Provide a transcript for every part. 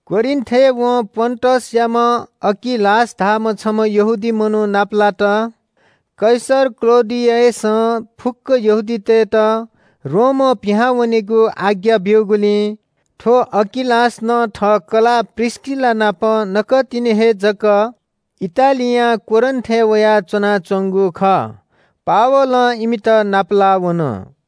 कोरिन्‍थय् वं पोन्‍टसयाम्‍ह अकिलास धाःम्‍ह छम्‍ह यहूदी मनू नापलात। कैसर क्‍लौडियसं फुक्‍क यहूदीतय्‌त रोमं पिहां वनेगु आज्ञा ब्‍यूगुलिं थ्‍व अकिलास नं थः कलाः प्रिस्‍किला नाप नकतिनि हे जक इटालियां कोरिन्‍थय् वयाः च्‍वनाच्‍वंगु खः। पावलं इमित नापलाः वन।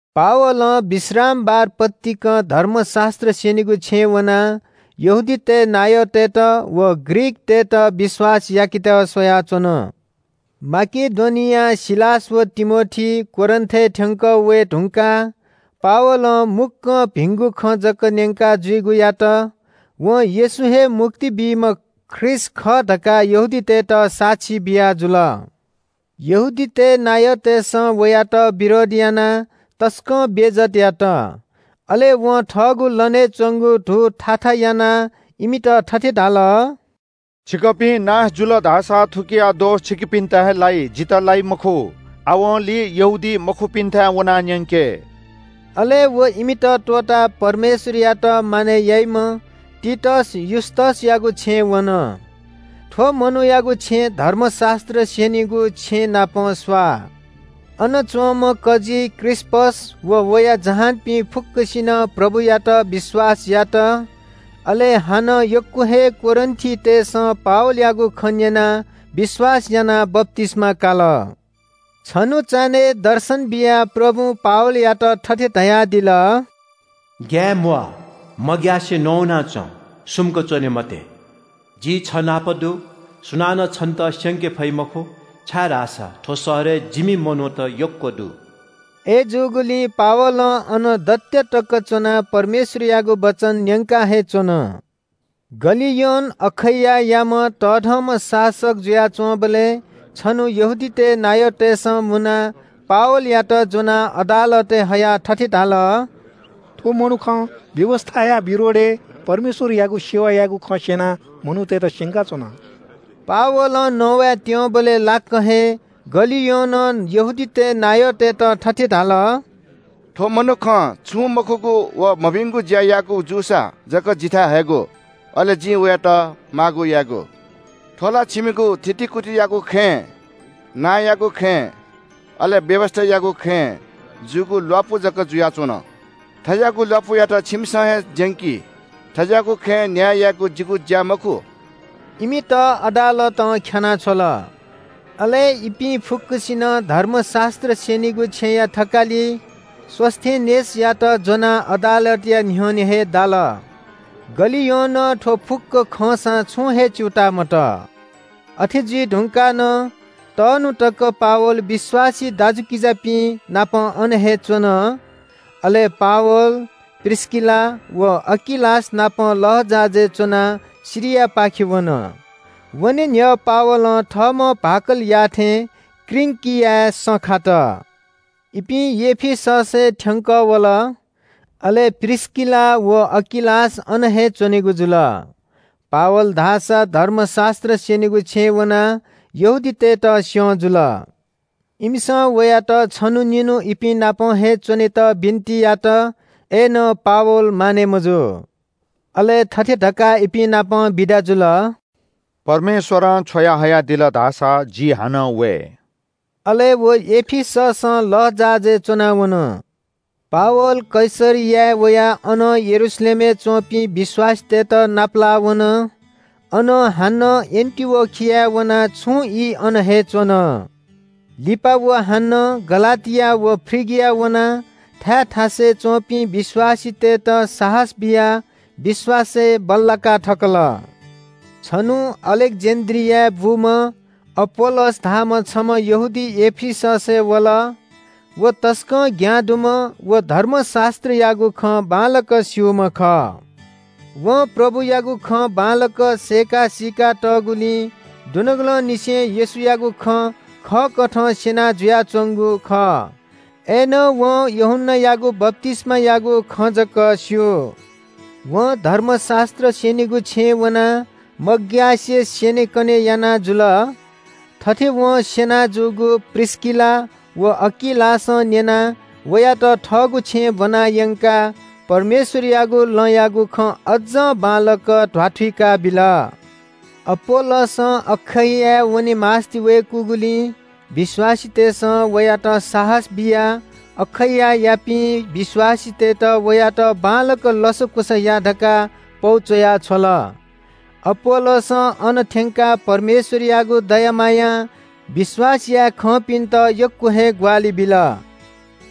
पावलं विश्रामबार पतिकं धर्मशास्‍त्र स्‍यनीगु छेँय् वनाः यहूदीतय् नायःतय्‌त व ग्रीकतय्‌त विश्‍वास याकेत स्‍वयाच्‍वन। माकेडोनियां सिलास व तिमोथी कोरिन्‍थय् थ्‍यंकः वये धुंकाः पावलं मुक्‍कं भिंगु खँ जक न्‍यंका जुइगु यात। वं येशू हे मुक्ति बीम्‍ह ख्रीष्‍ट खः धकाः यहूदीतय्‌त साक्षी बियाजुल। यहूदीतय् नायःतय्‌सं वयात विरोध यानाः तसकं बेइज्‍जत यात। अले वं थःगु लनय् च्‍वंगु धू थाथा यानाः इमित थथे धाल – “छिकपिं नाश जुल धाःसा थुकिया दोष छिकपिन्‍त हे लाइ, जितः लाइ मखु। आवंलि यहूदीमखुपिन्‍थाय् वनाः न्‍यंके।” अले व इमित त्‍वःताः परमेश्‍वरयात मानय् याइम्‍ह तीतस युस्‍तसयागु छेँय् वन। थ्‍व मनूयागु छेँ धर्मशास्‍त्र स्‍यनीगु छेँ नाप स्‍वाः। अन च्‍वंम्‍ह कजी क्रिस्‍पस व वया जहानपिं फुक्‍कसिनं प्रभुयात विश्‍वास यात। अले हानं यक्‍व हे कोरिन्‍थीतय्‌सं पावलयागु खँ न्‍यनाः विश्‍वास यानाः बप्‍तिस्‍मा काल। छन्‍हु चान्‍हय् दर्शन बियाः प्रभुं पावलयात थथे धयादिल – “ग्‍याये म्‍वाः, मग्‍यासे नवाना च्‍वँ, सुम्‍क च्‍वने मते। जि छ नाप दु। सुनानं छन्‍त स्‍यंके फइ मखु, छाय्‌धाःसा थ्‍व शहरय् जिमि मनूत यक्‍व दु।” अय्‌जूगुलिं पावलं अन दत्‍या तक च्‍वनाः परमेश्‍वरयागु वचन न्‍यंका हे च्‍वन। गलियोन अखैयायाम्‍ह तःधंम्‍ह शासक जुयाच्‍वंबलय् छन्‍हु यहूदीतय् नायःतय्‌सं मुनाः पावलयात ज्‍वनाः अदालतय् हयाः थथे धाल – “थ्‍व मनुखं व्‍यवस्‍थाया विरोधय् परमेश्‍वरयागु सेवा यायेगु खँ स्‍यनाः मनूतय्‌त स्‍यंकाच्‍वन।” पावलं नवाये त्‍यंबलय् लाक्‍क हे गलियोनं यहूदीतय् नायःतय्‌त थथे धाल – “थ्‍व मनुखं छुं मखुगु व मभिंगु ज्‍या याःगु जूसा जकं जिथाय् हयेगु, अले जिं वयात माःगु यायेगु। थ्‍व ला छिमिगु थितिकुतियागु खँय्, नांयागु खँय्, अले व्‍यवस्‍थायागु खँय् जूगु ल्‍वापु जक जुयाच्‍वन। थज्‍याःगु ल्‍वापुयात छिमिसं हे ज्‍यंकी। थज्‍याःगु खँय् न्‍याय यायेगु जिगु ज्‍या मखु।” इमित अदालतं ख्‍यानाः छ्वल। अले इपिं फुक्‍कसिनं धर्मशास्‍त्र स्‍यनीगु छेँया थकालि सोस्‍थेनेसयात ज्‍वनाः अदालतया न्‍ह्यःने हे दाल। गलियोनं थ्‍व फुक्‍क खंसां छुं हे च्‍यूताः मतः। अथे जुइ धुंकाः नं तःन्‍हु तक पावल विश्‍वासी दाजुकिजापिं नाप अन हे च्‍वन। अले पावल, प्रिस्‍किला व अकिलास नाप लःजहाजय् च्‍वनाः सिरियापाखे वन। वने न्‍ह्यः पावलं थःम्‍हं भाकल याःथें किंक्रियाय् सँ खात। इपिं एफिससय् थ्‍यंकः वल। अले प्रिस्‍किला व अकिलासयात अन हे त्‍वःतल। पावल धाःसा धर्मशास्‍त्र स्‍यनीगु छेँय् वनाः यहूदीतय्‌त स्‍यं जुल। इमिसं वयात छन्‍हु निन्‍हु इपिं नाप हे च्‍वनेत बिन्‍ति यात। अय्‌नं पावल मानय् मजू। अले थथे धकाः इपिं नाप बिदा जुल – “परमेश्‍वरं छ्वयाहयादिल धाःसा जि हानं वये।” अले व एफिससं लःजहाजय् च्‍वनाः वन। पावल कैसरियाय् वयाः अनं यरूशलेमय् च्‍वंपिं विश्‍वासीतय्‌त नापलाः वन। अनं हानं एन्‍टिओखियाय् वनाः छुं ई अन हे च्‍वन। लिपा व हानं गलातिया व फ्रिगिया वनाः थाय् थासय् च्‍वंपिं विश्‍वासीतय्‌त साहस बियाः विश्‍वासय् बल्‍लाका थकल। छन्‍हु अलेक्‍जेन्‍ड्रियाय् बूम्‍ह अपोल्‍लोस धाःम्‍ह छम्‍ह यहूदी एफिससय् वल। व तसकं ज्ञां दुम्‍ह व धर्मशास्‍त्रयागु खँ बांलाक स्‍यूम्‍ह खः। वं प्रभुयागु खँ बांलाक सय्‌का सीका तःगुलिं दुनुगलंनिसें येशूयागु खँ खःकथं स्‍यना जुयाच्‍वंगु खः। अय्‌नं वं यूहन्‍नायागु बप्‍तिस्‍मायागु खँ जक स्‍यू। वं धर्मशास्‍त्र स्‍यनीगु छेँय् वनाः मग्‍यासे स्‍यनेकने याना जुल। थथे वं स्‍यना जूगु प्रिस्‍किला व अकिलासं न्‍यनाः वयात थःगु छेँय् ब्‍वना यंकाः परमेश्‍वरयागु लँयागु खँ अज्‍जं बांलाक ध्‍वाथुइका बिल। अपोल्‍लोसं अखैयाय् वने मास्‍ति वय्‌कूगुलिं विश्‍वासीतय्‌सं वयात साहस बियाः अखैयायापिं विश्‍वासीतय्‌त वयात बांलाक लसकुस या धकाः पौ च्‍वया छ्वल। अपोल्‍लोसं अन थ्‍यंकाः परमेश्‍वरयागु दया मायां विश्‍वास याये खंपिन्‍त यक्‍व हे ग्‍वाहालि बिल।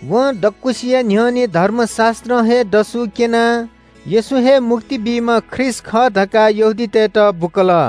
वं दक्‍वसिया न्‍ह्यःने धर्मशास्‍त्रं हे दसु क्‍यनाः येशू हे मुक्ति बीम्‍ह ख्रीष्‍ट खः धकाः यहूदीतय्‌त बुकल।